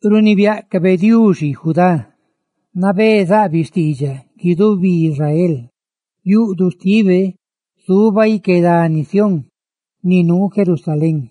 Runibiáꞌcabe Diuxi Judá; nabé zaꞌbiꞌ xtiidxaꞌ guidubi Israel. Yuꞌduꞌ xtibe zuba ique dani Sión, ni nuu Jerusalén;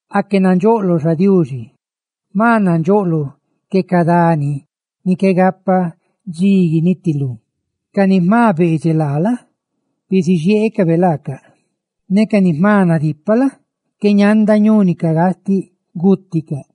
¡Aque nandxoꞌloꞌ, xa Diuxi! ¡Jma nandxoꞌloꞌ que ca dani ni qué gapa dxi gunitilú! Ca ni ná jma beedxeꞌ laa la? bisixieecabe laacaꞌ; ca ni jma nadipaꞌ la? qué ñanda ñúnicaꞌ gastiꞌ; ¡biluxe xpacaandacaꞌ gúticaꞌ!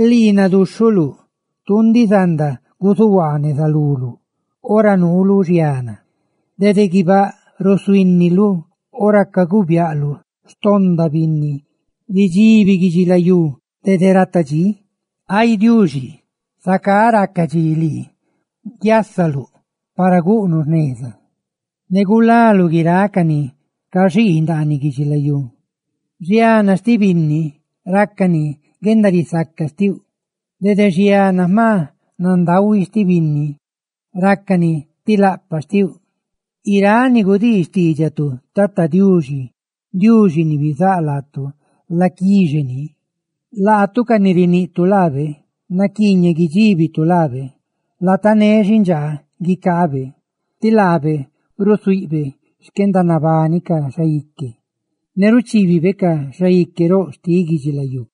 ¡Lii naduxhuluꞌ! Tuu ndiꞌ zanda guzuhuaa neza luluꞌ ora nuuluꞌ xiana. Dede guibáꞌ rusuhuíniluꞌ ora caguu biaꞌluꞌ xtonda binni; ridxibi guidxilayú dede rata dxí, ay Diuxi, zacá raca dxi lii guiasaluꞌ para guꞌnuꞌ jneza, ne gulaluꞌ guiráꞌ ca ni caxii ndaaniꞌ guidxilayú diꞌ. Xiana xtiꞌ binni rácani ti guendarisaca xtiuꞌ; ¡dede xiana jma nandahui xtiꞌ binni rácani ti laꞌpaꞌ xtiuꞌ! Guiráꞌ ni gudii xtiidxatu Tata Diuxi, Diuxi ni bizáꞌ laatu, laguni ni. Laatu, ca ni riguutu leꞌ ni naquiiñeꞌ guidxíbitu laa, ¡latané xindxaa guicaabe! Ti laabe ráxhabe xquendanabani ca xaique ne ruchibibe ca xaique roꞌ xtiꞌ guidxilayú.